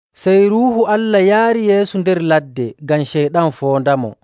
Sey Ruuhu Allah yaari Yeesu nder ladde ngam Ceyɗan foondamo..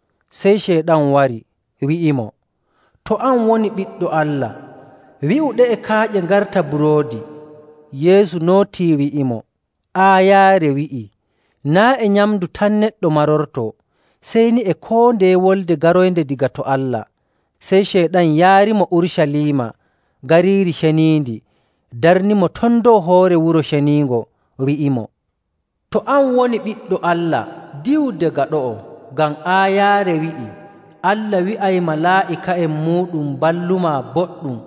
Sey Ceyɗan wari, wi'imo, “To an woni Ɓiɗɗo Allah, wi'u ɗe'e kaaƴe ngarta buroodi.” Yeesu nootii wi'imo, “Aayaare wi'ii, ‘Naa' e nyamndu tan neɗɗo marortoo, sey ni e koo ndeye wolde garoynde daga to Allah.’”. Sey Ceyɗan yaarimo Urucaliima Gariiri Ceniindi darnimo ton dow hoore Wuro Ceniingo, wi'imo, “To an woni Ɓiɗɗo Allah, diwu daga ɗo'o ngam aayaare wi'ii, ‘Allah wi'ay malaa'ika'en muuɗum mballumaa boɗɗum.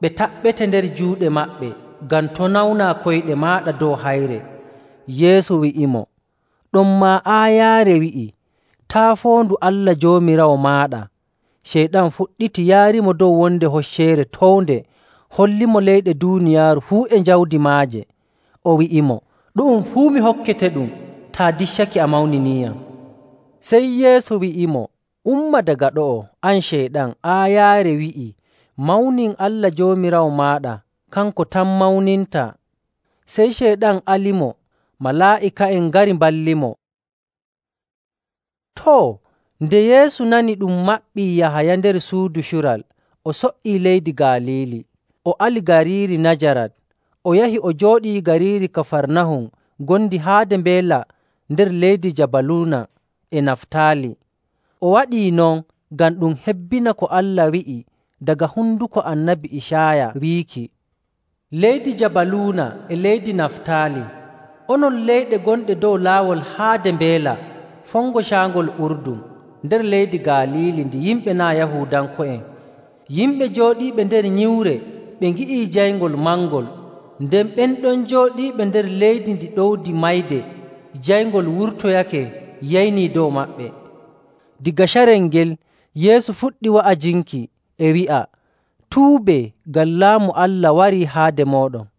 Ɓe taɓɓete nder juuɗe maɓɓe, ngam to' nawnaa koyɗe maaɗa dow hayre.’”. Yeesu wi'imo, “Ɗonmaa aayaare wi'ii, ‘Taa' foondu Allah Joomiraawo maaɗa!’”. Ceyɗan fuɗɗiti yaarimo dow wonde hocceere townde hollimo leyɗe duuniyaaru fuu e jawdi maaje, o wi'imo, “Ɗu'um fuu mi hokketeɗum taa diccake a mawniniiyam.” Sey Yeesu wi'imo, “Umma daga ɗo'o, an Ceyɗan! Aayaare wi'ii, ‘Mawnin Allah Joomiraawo maaɗa, kanko tan mawnintaa.’”. Sey Ceyɗan alimo, malaa'ika'en ngari mballimo. Too, nde Yeesu nani ɗum maɓɓii Yahaya nder suudu cural, o so''ii leydi Galiili.. O ali gariiri Najarat, o yahi o jooɗii gariiri Kafarnahum ngondi haade mbeela nder leydi Jabaluuna e Naftaali.. O waɗii non ngam ɗum hebbina ko Allah wi'i daga honduko Annabi Icaaya wiiki, “Leydi Jabaluuna e leydi Naftaali, onon leyɗe gonɗe dow laawol haade mbeela, fongo Caangol Urdun, nder leydi Galiili ndi yimɓe naa' Yahuudanko'en! Yimɓe jooɗiiɓe nder nyiwre ɓe ngi'ii jayngol mangol, nden ɓen ɗon jooɗiiɓe nder leydi ndi ɗowdi mayde, jayngol wurtoyake yeyni dow maɓɓe.”. Daga carel ngel, Yeesu fuɗɗi wa'ajinki, e wi'a, “Tuubee, ngam Laamu Allah warii haade mooɗon.”.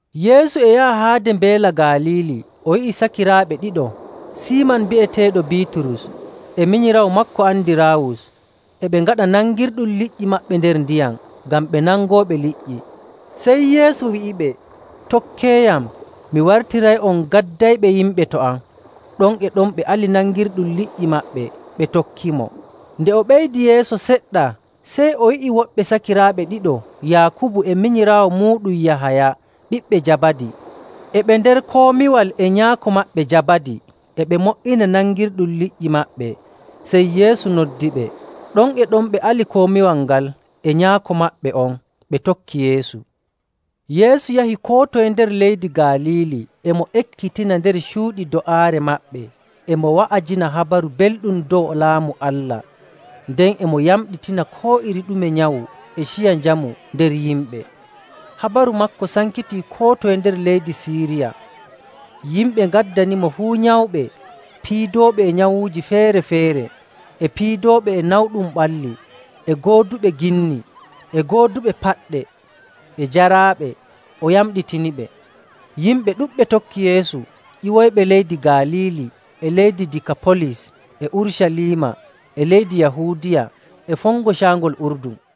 Yeesu e yaha haade Mbeela Galiili, o yi'i sakiraaɓe ɗiɗo, Siiman bi'eteeɗo Biiturus e minyiraawo maako Andiraawus, e ɓe ngaɗa nangirɗum liƴƴi maɓɓe nder ndiyam, ngam ɓe nangooɓe liƴƴi. Sey Yeesu wi'iɓe, “Tokkeeyam, mi wartiray'on gaddayɓe yimɓe to am.” Ɗon e ɗon ɓe ali nangirɗum liƴƴi maɓɓe ɓe tokkimo. Nde o ɓeydi yeeso seɗɗa, sey o yi'i woɓɓe sakiraaɓe ɗiɗo, Yaakubu e minyiraawo muuɗum Yahaya ɓiɓɓe Jabadi, e ɓe nder komiwal e nyaako maɓɓe Jabadi, e ɓe mo''ina nangirɗum liƴƴi maɓɓe, sey Yeesu noddiɓe. Ɗon e ɗon ɓe ali komiwal ngal e nyaako maɓɓe on, ɓe tokki Yeesu. Yeesu yahi koo toye nder leydi Galiili, e mo ekkitina nder cuuɗi do'aare maɓɓe, e mo wa'ajina Habaru Belɗum dow Laamu Allah, nden e mo yamɗitina koo iri ɗume nyawu e ciya njamu nder yimɓe.. Habaru maako sankiti koo toye nder leydi Siiriya. Yimɓe ngaddanimo fuu nyawɓe, piidooɓe e nyawuuji feere‑feere, e piidooɓe e nawɗum ɓalli, e gooduɓe ginni, e gooduɓe paɗɗe, e jaraaɓe, o yamɗitiniɓe. Yimɓe ɗuɗɓe tokki Yeesu ƴiwoyɓe leydi Galiili, e leydi Dikapolis: Waato Gariije Sappo., e Urucaliima, e leydi Yahuudiya, e fongo Caangol Urdun.